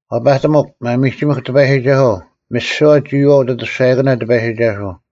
ᐛᐸᑎᒥᒄ, ᒪᒥᒋᒥᐧᒄ ᑎᐸᔨᒋᒐᓱᐤ, ᒥᓯᐛ ᒋᔨᐛᐤ ᐅᑦ ᐊᑐᔅᒐᔭᑭᓇ ᑎᐸᔨᒋᒐᓱᐤ;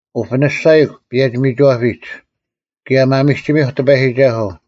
ᐅᐱᓂᔅᒐᔨᒃ, ᐸᔭᒋ-ᒥᒋᐛᐱᒡ, ᑭᔭ ᒪᒥᒋᒥᐧᒄ ᑎᐸᔨᒋᒐᓱᐤ!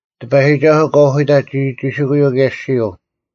ᑎᐸᔨᒋᒐᓱᐤ, ᑲ ᐅᓯᑕᑦ ᒋᒋᒋᓯᑯᔪᐤ ᑭᔭ ᐊᔅᒋᔪᐤ,